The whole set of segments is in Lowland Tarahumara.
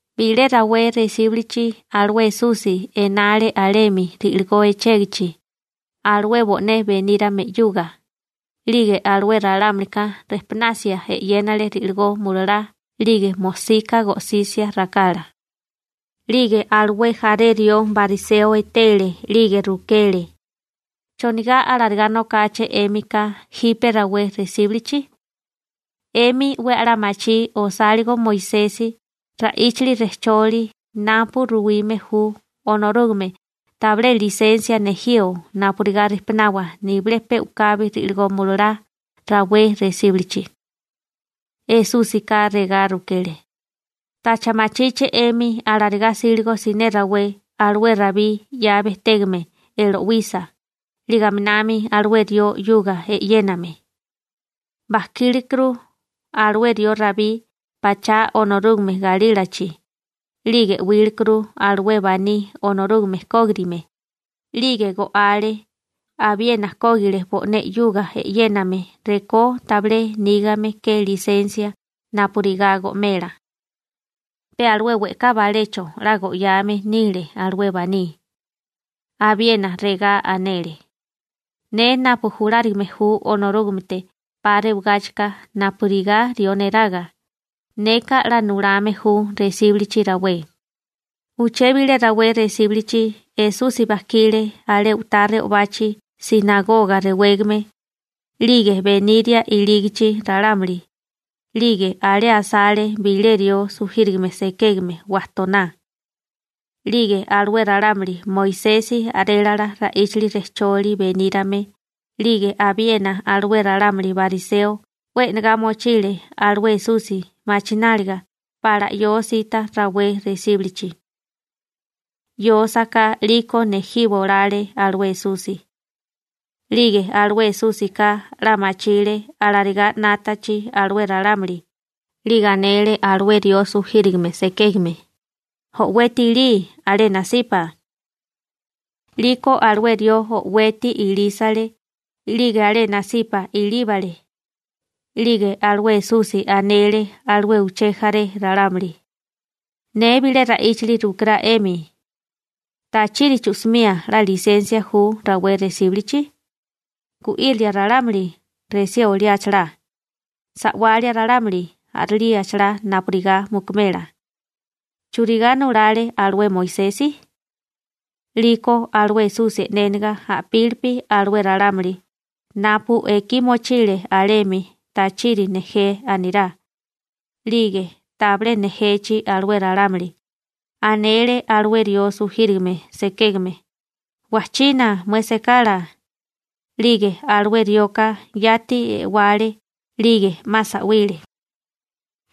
Bilé rawé resíbulichi alué Esusi enale alemi ri'ligó echégichi alué bo'né benírame 'yuga, 'lige alué ralámulika rejpunasia e'yénale ri'ligó mulalá 'lige mojsika go'sisia rakala. 'Lige alué jaré rió bariseo etele 'lige rukele: ―¿Chonigá alarigá nokáché 'émika jipe rawé resíbulichi? 'Emi 'we a'lá machí osáligo Moisesi ra'íchali rejcholi napu ruwime ju Onorúgame tabilé lisensia nejío napurigá rijpunawa nibilé pe u'kabi ri'ligó mulalá rawé resíbulichi. Esúsika regá rukele: ―¿Tacha machíché 'emi alarigá 'sílego siné rawé alué Rabí 'ya bejtégame e'lowisa 'lige aminami alué rió 'yuga e'yéname? Bajkílekuru alué rió Rabí pachá Onorúgame galílachi, 'lige 'wílekuru alué baní Onorúgame kógirigame 'lige go'ale, abiena kógile bo'né 'yuga e'yéname rekó tabilé nígame ke lisensia napurigá go'mela. Pe alué we'ká balecho 'la go'yame nile alué baní. Abiena regá anele: ―Ne napu julárigame ju Onorúgamete 'pa rewagáchika napurigá rió neraga, neka 'la nulame ju resíbulichi rawé. Uché bilé rawé resíbulichi Esusi bajkile alé u'tá re'obachi «sinagoga» rewégame, 'lige beniria ilígichi ralámuli, 'lige alé asale bilé rió sujírigame sekégame wajtoná. 'Lige alué ralámuli Moisesi a'rélala ra'íchali rejcholi benírame 'lige abiena alué ralámuli bariseo 'we e'negá mochile alué Esusi machináliga pala 'yósíta rawé resíbulichi. 'Yósaká 'liko nejiwa olale alué Esusi. 'Lige alué Esúsika 'la machile alarigá 'nátachi alué ralámuli, 'lige anele alué rió sujírigame sekégame: ―O'weti ilí alé nasipa. 'Liko alué rió o'weti ilísale 'lige alé nasipa ilíbale. 'Lige alué Esusi anele alué uché jaré ralámuli: ―Ne bilé ra'íchali rukirá 'emi. ¿Tachiri chu'simía 'la lisensia ju rawé resíbulichi? ¿Gu'írilia ralámuli, resí oliáchalá? ¿Sa'walia ralámuli, a'rilíachalá napurigá mukumela? ¿Churigá nulale alué Moisesi? 'Liko alué Esusi e'néniga a'pílipi alué ralámuli napu ekí mochile alemi tachiri nejé anirá, 'lige tabilé nejechi alué ralámuli anele alué rió sujírigame sekégame: ―¡Wajchiná mué sekala! 'Lige alué rioka yati e'wale 'lige 'ma sa'wile.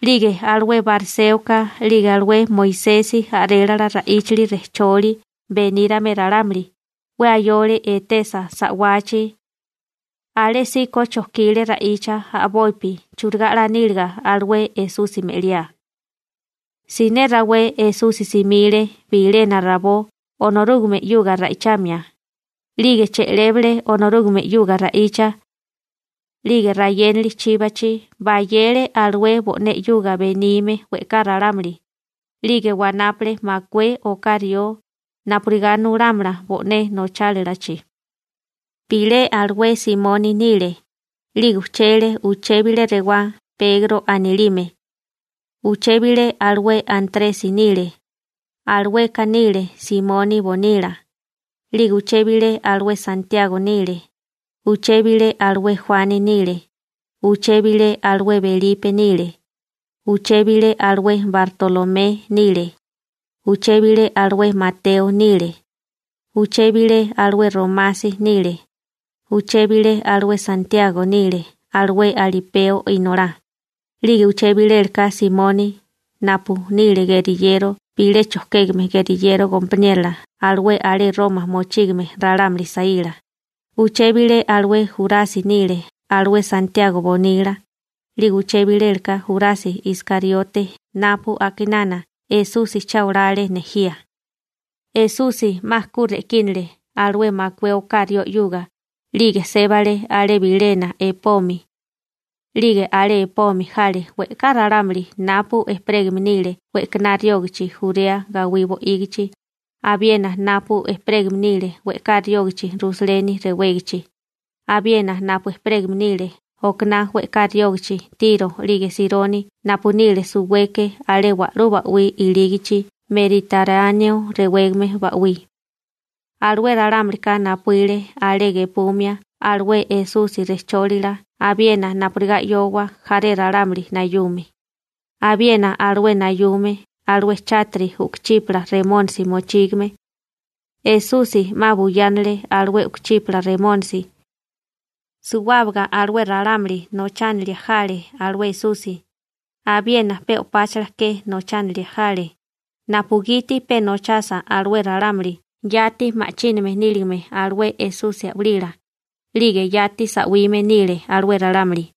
'Lige alué bariséoka 'lige alué Moisesi a'rélala ra'íchali rejcholi benírame ralámuli 'we ayole etesa sa'wachi. Alésíko chojkile ra'icha a'bopi churigá 'la níliga alué Esusi me'liá. Siné rawé Esusi simile bilena rabó Onorúgame 'yuga ra'ichamia, 'lige che'lébale Onorúgame 'yuga ra'icha. 'Lige rayénali chíbachi, bayele alué bo'né 'yuga benime we'ká ralámuli, 'lige wanápale makué oká rió napurigá nulámala bo'né nochálalachi. Bilé alué Simoni nile, 'lige ujchele uché bilé rewá Pegro anilime. Uché bilé alué Antresi nile. Alueka nile Simoni bonila. 'Lige uché bilé alué Santiago nile, uché bilé alué Juani nile, uché bilé alué Belipe nile, uché bilé alué Bartolomé nile, uché bilé alué Mateo nile, uché bilé alué Romasi nile, uché bilé alué Santiago nile alué Alipeo inolá, 'lige uché bilela Simoni napu nile geriyero bilé chojkégame geriyero gompaniérola alué alé Roma mochígame ralámuli saíla, uché bilé alué Jurasi nile alué Santiago bonila, 'lige uché bilela Jurasi Iskariote napu a'kinana Esusi cha olale nejía. Esusi 'ma ku re'kínale alué makué oká rió 'yuga, 'lige sébale alé bilena epomi. 'Lige alé epomi jale we'ká ralámuli napu ejperégame nile we'kaná riógachi Jurea gawí bo'ígichi, abiena napu ejperégame nile we'ká riógachi Rusaleni rewégachi, abiena napu ejperégame nile okaná we'ká riógachi Tiro 'lige Sironi napu nile suweke alé wa'lú ba'wí ilígichi Meriteráneo rewégame ba'wí. Alué ralámulika napuíle alé gepumia alué Esusi rejchólila abiena napurigá 'yóowa jaré ralámuli nayume, abiena alué nayume alué chátiri u'kuchípala remónisi mochígame. Esusi 'ma buyánale alué u'kuchípala remónisi. Suwábaga alué ralámuli nochánilia jale alué Esusi, abiena pe o'páchala ke nochánilia jale, napugiti pe nochasa alué ralámuli yati ma'chíname níligame alué Esusi a'walila, 'lige yati sa'wime nile alué ralámuli. ›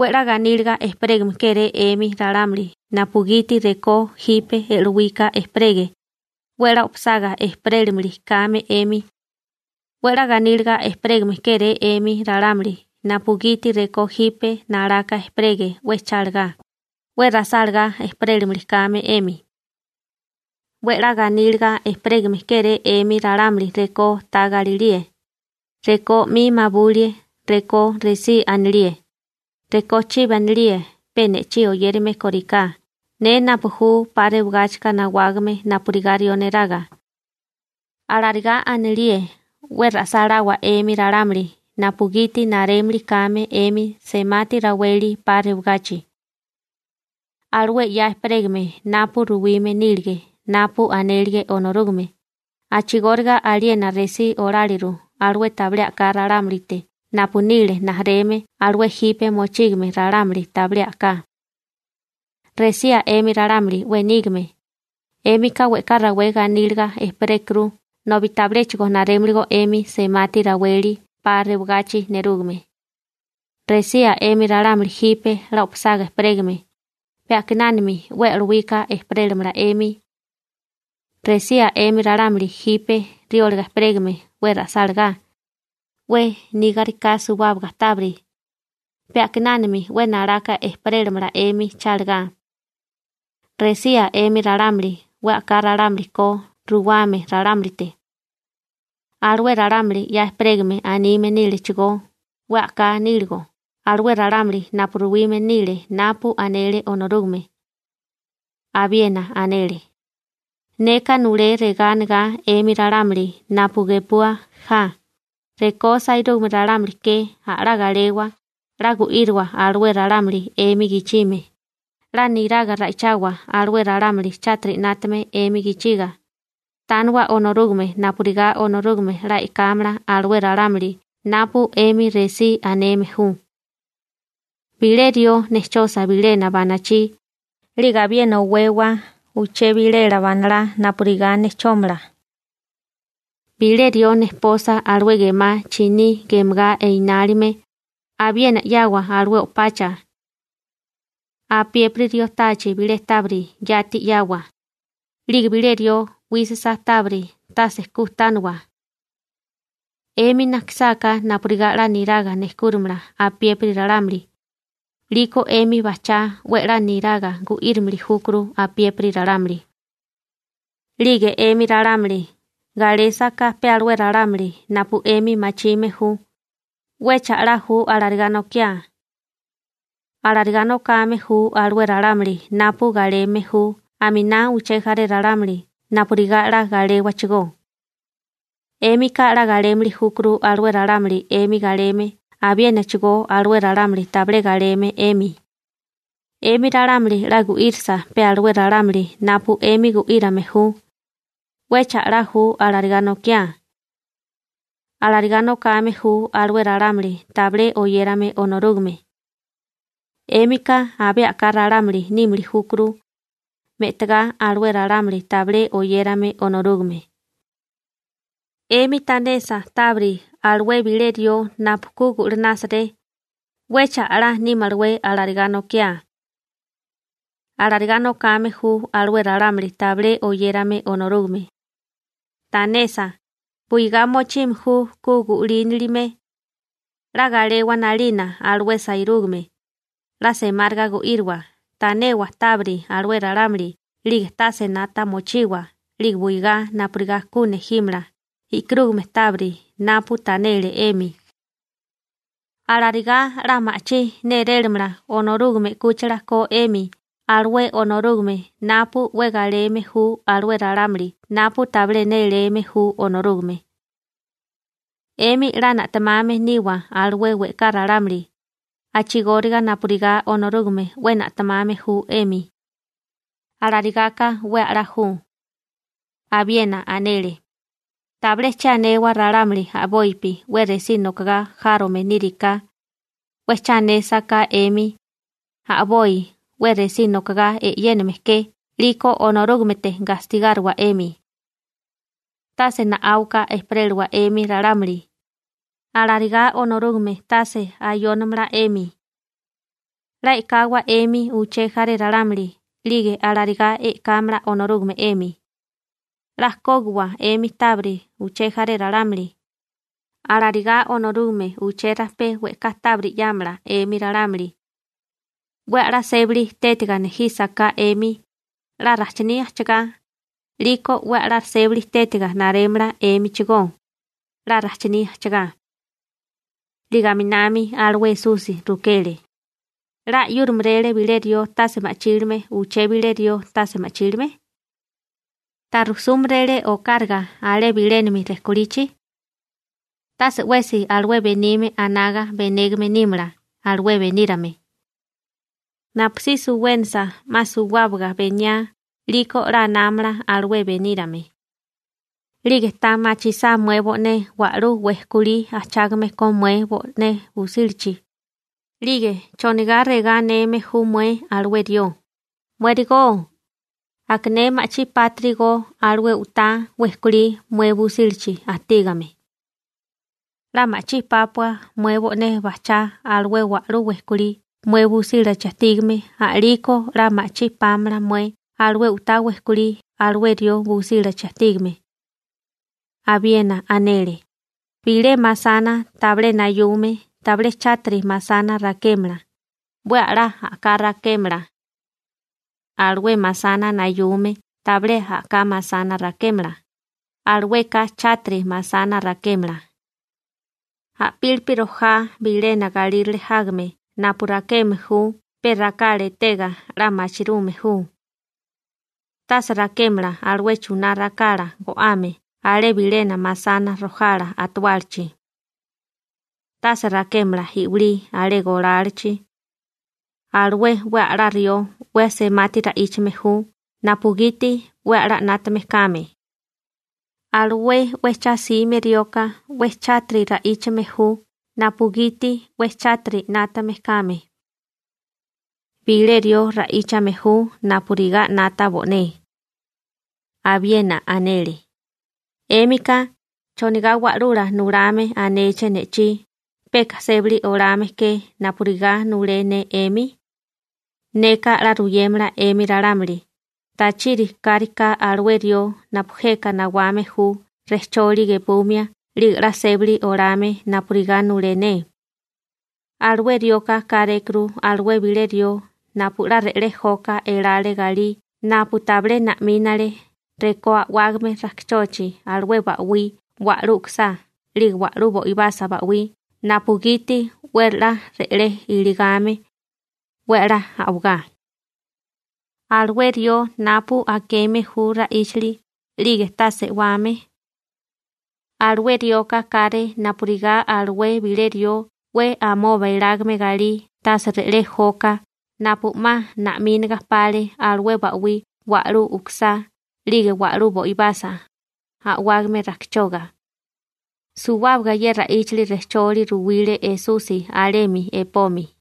Onorúgame 'we ganíliga eteme ju 'emi napugiti rekó jipe e'lowika ejperege, 'we 'la o'pasaga ejperélimili kame 'emi. › Onorúgame 'we ganíliga eteme ju 'emi napugiti rekó jipe nalaka ejperege 'we chálagá, 'we ra'sálagá ejperélimili kame 'emi. › Onorúgame 'we ganíliga eteme ju 'emi rekó ta galilíe, rekó 'mi mabulie, rekó resí anilíe, rekó chibi anilíe pe ne'chí oyérame kóriká ne napu ju 'pa rewagáchika nawágame napurigá rió neraga. Alarigá anilíe, 'we ra'sáláwa 'emi ralámuli napugiti narémili kame 'emi semati raweli 'pa rewagachi. Alué 'ya ejperégame napu ruwime nílige napu anélige Onorúgame a'chigóriga aliena resí oláliru alué tabilé a'ká ralámulite napu nile rijimala alué jipe mochígame ralámuli tabilé a'ká. › Resía 'emi ralámuli 'we nígame, 'émika we'ká rawé ganíliga ejperékuru nobi tabiléchigo narémiligó 'emi semati raweli 'pa rewagachi nerúgame. › Resía 'emi ralámuli jipe 'la o'pasaga ejperégame, pe a'kinánami 'we e'lowika ejperélamala 'emi. › Resía 'emi ralámuli jipe riólaga ejperégame 'we ra'sálagá, 'we nígariká suwábaga tábiri, pe a'kinánami 'we nalaka ejperélamala 'emi chalagá. › Resía 'emi ralámuli 'we a'ká ralámuli ko ruwame ralámulite. Alué ralámuli 'ya ejperégame anime nílechigó 'we a'ká níligo alué ralámuli napu ruwime nile napu anele Onorúgame. Abiena anele: ―Neka nulé regá anegá 'emi ralámuli napu gepua ja: Rekó sairúgame ralámuli ke, a'lá galewa, 'la gu'íriwa alué ralámuli 'emi gichime, 'la niraga ra'ichawa alué ralámuli 'yuga alué ralámuli chátiri 'nátame 'emi gichiga, tániwa Onorúgame napurigá Onorúgame 'la e'kámala alué ralámuli napu 'emi resí aneme ju. Bilé rió nejchosa bilena banachí, 'lige abiena owewa uché bilela banalá napurigá nejchómala. Bilé rió nejposa alué gemá chiní gemagá enálime, abiena 'yawa alué o'pacha. Apiépiri rió táachi bilé tábiri, yati 'yawa, 'lige bilé rió 'wísisa tábiri, tase ku tániwa. 'Emi najkisáká napurigá 'la niraga nejkúramala apiépiri ralámuli, 'liko 'emi bajchá 'we 'la niraga gu'írimili júkuru apiépiri ralámuli. › 'Lige 'emi ralámuli galésaká pe alué ralámuli napu 'emi machime ju, ¿'wecha a'lá ju alarigá nokiá? Alarigá nokame ju alué ralámuli napu galeme ju aminá uché jaré ralámuli napurigá 'la galéwachigó. 'Émika 'la galémili júkuru alué ralámuli 'emi galeme, abiénachigó alué ralámuli tabilé galeme 'emi. 'Emi ralámuli 'la gu'írisa pe alué ralámuli napu 'emi gu'írame ju, ¿'wecha a'lá ju alarigá nokiá? Alarigá nokame ju alué ralámuli tabilé oyérame Onorúgame. 'Émika abé a'ká ralámuli nímili júkuru, me'tagá alué ralámuli tabilé oyérame Onorúgame. 'Emi tanesa tábiri alué bilé rió napu ku 'la gu'linásaré, ¿'wecha a'lá nímalawé alarigá nokiá? Alarigá nokame ju alué ralámuli tabilé oyérame Onorúgame. Tanesa, buigá mochime ju ku gu'línilime. 'La galewa 'nalina alué sairúgame, 'la semáriga gu'íriwa, tanewa tábiri alué ralámuli 'lige tase 'nata mochiwa 'lige buigá napurigá ku nejímala e'karúgame tábiri napu tanele 'emi. Alarigá 'la ma'chí nérélamala Onorúgame 'kúchila ko 'emi alué Onorúgame napu 'we galeme ju alué ralámuli napu tabilé néléme ju Onorúgame. 'Emi 'la na'temame niwa alué we'ká ralámuli, a'chigóriga napurigá Onorúgame 'we na'temame ju 'emi. Alarigáká 'we a'lá ju. Abiena anele: ―Tabilé che anewa ralámuli a'bopi 'we resí nokagá járome níriká, 'we cha anésaká 'emi, a'boi 'we resí nokagá e'yéname ke 'liko Onorúgamete gastigáriwa 'emi. Tase na'áuka ejperélawa 'emi ralámuli, alarigá Onorúgame tase ayónamala 'emi. 'La e'kawa 'emi uché jaré ralámuli 'lige alarigá e'kámala Onorúgame 'emi. 'La kógiwa 'emi tábiri uché jaré ralámuli, alarigá Onorúgame uché rajpé we'ká tábiri 'yámala 'emi ralámuli. 'We a'lá sébali tétiga nejísaká 'emi, 'la rajchiní ajchagá, 'liko 'we a'lá sébali tétiga narémala 'émichigó, 'la rajchiní ajchagá. 'Lige aminami alué Esusi rukele: ―¿'La 'yúrimeréle bilé rió tase ma'chílime uché bilé rió tase ma'chílime? ¿Ta rujsúmerélé okáraga alé bilénami rejkolichi? Tase 'wesi alué benime anaga benégame nímala alué benírame. Napusí suwénasa 'ma suwábaga beniá 'liko 'la anámala alué benírame. › 'Lige ta machisá mué bo'né wa'lú wejkolí ajchágame ko mué bo'né busílachi, 'lige ¿chonigá regá aneme ju mué alué rió: «Muérigó, aka ne ma'chí pátirigo alué u'tá wejkolí mué busílachi ajtígame»? 'La ma'chí pápua mué bo'né bajchá alué wa'lú wejkolí mué busílachi ajtígame a'liko 'la ma'chí pámala mué alué u'tá wejkolí alué rió busílachi ajtígame. Abiena anele: ―Bilé masana tabilé nayume tabilé chátiri masana rakémala, 'we a'lá a'ká rakémala. Alué masana nayume tabilé a'ká masana rakémala, alueka chátiri masana rakémala. A'pílipi rojá bilena galírale jágame napu rakeme ju pe rakala etega 'la machirume ju. Tase rakémala alué chuná rakala go'ame alé bilena masana rojala atuálachi. Tase rakémala i'wilí alé golálachi. Alué 'we a'lala rió 'we semati ra'íchame ju napugiti 'we a'lá 'nátame kame. Alué 'we cha'sime rioka 'we chátiri ra'íchame ju napugiti 'we chátiri 'nátame kame. Bilé rió ra'íchame ju napurigá 'nata bo'né. Abiena anele: ―'Émika ¿chonigá wa'lula nulame anéché ne'chí, peka sébali olame ke napurigá nulé ne 'emi? Neka 'la ruyémala 'emi ralámuli tachiri káriká alué rió napu jeka nawame ju rejcholi gepumia 'lige 'la sébali olame napurigá nulé ne. Alué rioka kárékuru alué bilé rió napu 'la re'lé joka elale galí napu tabilé na'mile rekó a'wágame rajkichochi alué ba'wí wa'lú u'kusá 'lige wa'lú bo'ibasa ba'wí napugiti 'we 'la re'lé ilíligame, 'we a'lá a'wagá. Alué rió napu akeme ju ra'íchali 'lige tase e'wame, alué rioka káré napurigá alué bilé rió 'we amoba elágame galí tase re'lé joka napu 'ma na'mínaga pale alué ba'wí wa'lú u'kusá 'lige wa'lú bo'ibasa, a'wágame rajkichoga. Suwábaga ye ra'íchali rejcholi ruwile Esusi alemi epomi.